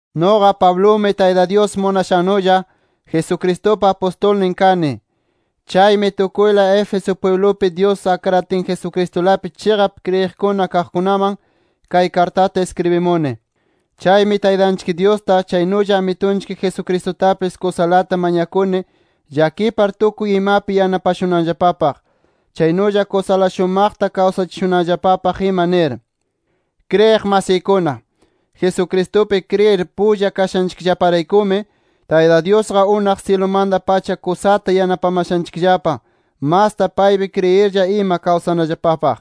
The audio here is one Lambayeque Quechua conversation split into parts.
Nuqa Pablumi, Tayta Dyus munashannulla Jesucristupa apustulnin kani. Chaymi tukuyla Éfeso pwiblupi Dyus akratin Jesucristulapi chiqap kriyiq kaqkunaman, kay kartata iskribimuni. Chaymi Taytanchik Dyusta, chaynulla Amitunchik Jesucristutapis kusalata mañakuni llakipar tukuy imapi yanapashunanllapapaq, chaynulla kusala shumaqta kawsachishunanllapapaq ima nir. Kriyiq masiykuna, Jesucristupi kriyir pulla kashanchikllaparaykumi, Tayta Dyusqa unaq syilumanta-pacha kusata yanapamashanchikllapa masta paypi kriyirlla ima kawsanallapapaq.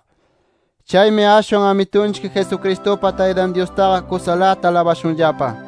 Chaymi ashwan, Amitunchik Jesucristupa Taytan Dyustaqa kusalata alabashunllapa.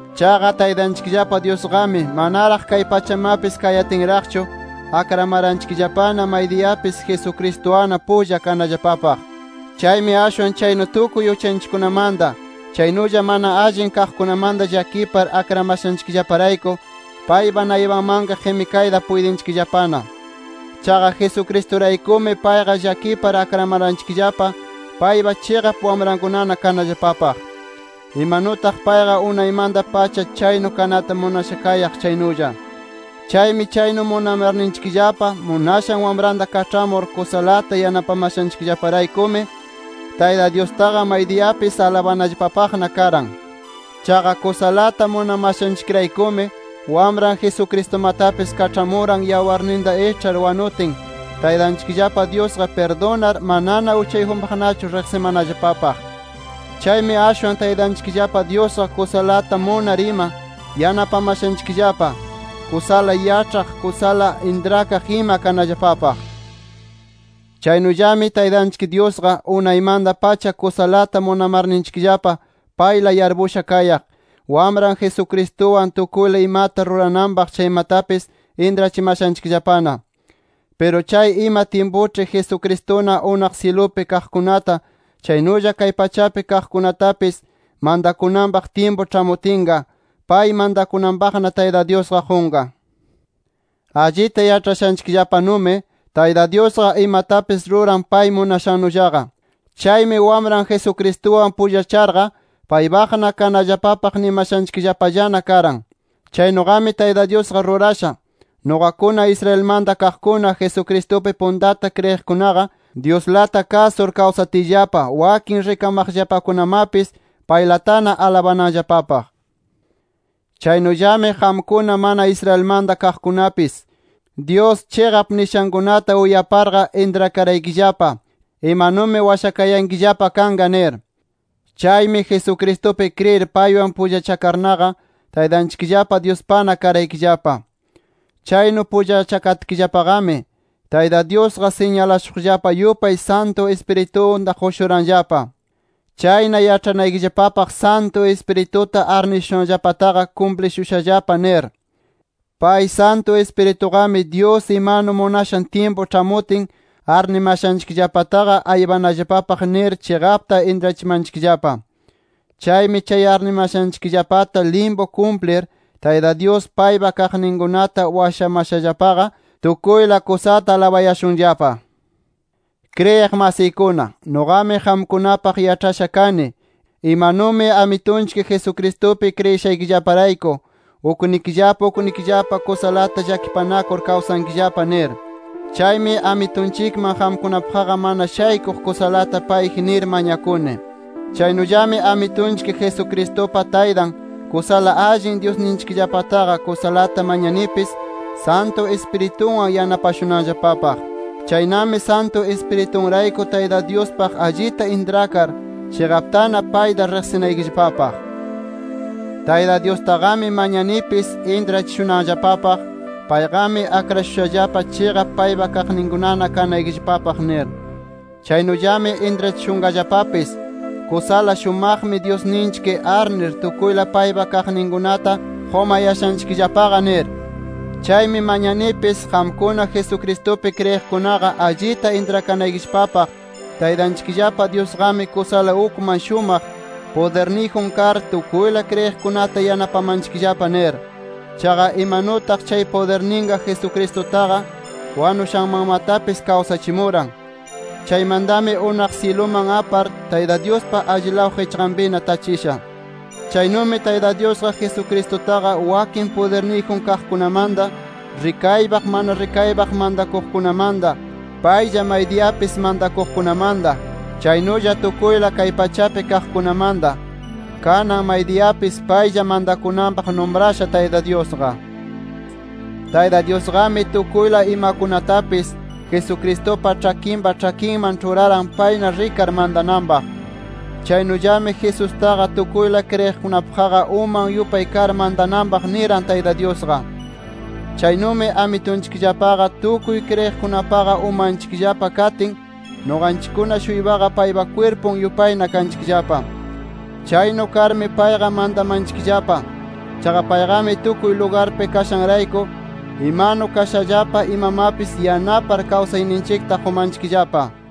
Chaqa Taytanchikllapa Dyusqami manaraq kay pachamapis kayatinraqchu, akramaranchikllapana maydiyapis Jesucristuwanna pulla kanallapapaq. Chaymi ashwan chaynu tukuy uchanchikkunamanta, chaynulla mana allin kaqkunamanta llakipar akramashanchikllaparayku, paypa naypanmanqa qimikayta puytinchikllapana. Chaqa Jesucristuraykumi payqa llakipar akramaranchikllapa paypa chiqap wamrankunana kanallapapaq, imanutaq payqa unaymanta-pacha chaynu kanata munasha kayaq chaynulla. Chaymi chaynu munamarninchikllapa munashan Wamranta kaĉhamur kusalata yanapamashanchikllaparaykumi, Tayta Dyustaqa maydiyapis alabanallapapaqna karan. Chaqa kusalata munamashanchikraykumi, Wamran Jesucristumatapis kaĉhamuran yawarninta iĉhar wanutin, Taytanchikllapa Dyusqa pirdunar, manana uchayjunpaqnachu riqsimanallapapaq. Chaymi ashwan Taytanchikllapa Dyusqa kusalata munar ima yanapamashanchikllapa, kusala yaĉhaq, kusala intrakaq ima kanallapapaq. Chaynullami Taytanchik Dyusqa, unaymanta-pacha kusalata munarninchikllapa payla yarpusha kayaq, Wamran Jesucristuwan tukuyla imata rurananpaq chaymatapis intrachimashanchikllapana. Piru chay ima tyimpuĉhi Jesucristuna unaq syilupi kaqkunata, chaynulla kay pachapi kaqkunatapis, mantakunanpaq tyimpu ĉhamutinqa, pay mantakunanpaqna Tayta Dyusqa qunqa. Allita yaĉhashanchikllapanumi Tayta Dyusqa imatapis ruran pay munashannullaqa. Chaymi Wamran Jesucristuwan pullacharqa, paypaqna kanallapapaq nimashanchikllapallana karan. Chaynuqami Tayta Dyusqa rurasha, nuqakuna Israelmanta kaqkuna Jesucristupi puntata kriyiqkunaqa, Dyuslata kasur kawsatiyllapa, wakin rikamaqllapakunamapis paylatana alabananllapapaq. Chaynullami qamkuna mana Israelmanta kaqkunapis, Dyus chiqap nishankunata uyaparqa, intrakaraykillapa imanumi washakayankillapa kanqa nir. Chaymi Jesucristupi kriyir paywan pullachakarnaqa, Taytanchikllapa Dyuspana karaykillapa. Chaynu pullachakatkillapaqami, Tayta Dyusqa siñalashuqllapa yupay Santu Ispiritunta qushuranllapa. Chayna yaĉhanaykillapapaq Santu Ispirituta arnishushanllapataqa kumplishushallapa nir. Pay Santu Ispirituqami, Dyus imanu munashan tyimpu ĉhamutin arnimashanchikllapataqa aypanallapapaq nir chiqapta intrachimanchikllapa. Chaymi chay arnimashanchikllapata limpu kumplir Tayta Dyus paypa kaqninkunata washamashallapaqa, tukuyla kusata alabayashunllapa. Kriyiq masiykuna, nuqami qamkunapaq yaĉhasha kani imanumi Amitunchik Jesucristupi kriyishaykillaparayku, uknikillapa uknikillapa kusalata llakipanakur kawsankillapa nir. Chaymi Amitunchikman qamkunapaqqa mana shaykuq kusalata payji nir mañakuni. Chaynullami Amitunchik Jesucristupa Taytan, kusala allin Dyusninchikllapataqa kusalata mañanipis Santu Ispiritunwan yanapashunanllapapaq. Chaynami Santu Ispiriturayku Tayta Dyuspaq allita intrakar, chiqaptana payta riqsinaykillapapaq. Tayta Dyustaqami mañanipis intrachishunanllapapaq, payqami akrashushallapa chiqap paypa kaqninkunana kanaykillapapaq nir. Chaynullami intrachishunqallapapis kusala shumaqmi Dyusninchik arnir tukuyla paypa kaqninkunata qumayashanchikllapaqa nir. Chaymi mañanipis qamkuna Jesucristupi kriyiqkunaqa allita intrakanaykillapapaq Taytanchikllapa Dyusqami kusala ukman shumaq pudirniyjun kar tukuyla kriyiqkunata yanapamanchikllapa nir. Chaqa imanutaq chay pudirninqa Jesucristutaqa wanushanmanmatapis kawsachimuran. Chaymantami unaq syiluman apar, Tayta Dyuspa allilaw qichqanpina tachisha. Chaynumi Tayta Dyusqa Jesucristutaqa wakin pudirniyjun kaqkunamanta, rikaypaq mana rikaypaq mantakuqkunamanta, paylla maydiyapis mantakuqkunamanta, chaynulla tukuyla kay pachapi kaqkunamanta, kanan maydiyapis paylla mantakunanpaq numrasha Tayta Dyusqa. Tayta Dyusqami tukuyla imakunatapis, Jesucristupa ĉhakinpa ĉhakinman ĉhuraran, payna rikar mantananpaq. Chaynullami Jesustaqa tukuyla kriyiqkunapaqqa uman yupay kar mantananpaq niran Tayta Dyusqa. Chaynumi Amitunchikllapaqa, tukuy kriyiqkunapaqa umanchikllapa katin, nuqanchikkuna-shuypaqa paypa kwirpun yupayna kanchikllapa. Chaynu karmi payqa mantamanchikllapa. Chaqa payqami tukuy lugarpi kashanrayku imanu kashallapa imamapis yanapar kawsayninchikta qumanchikllapa.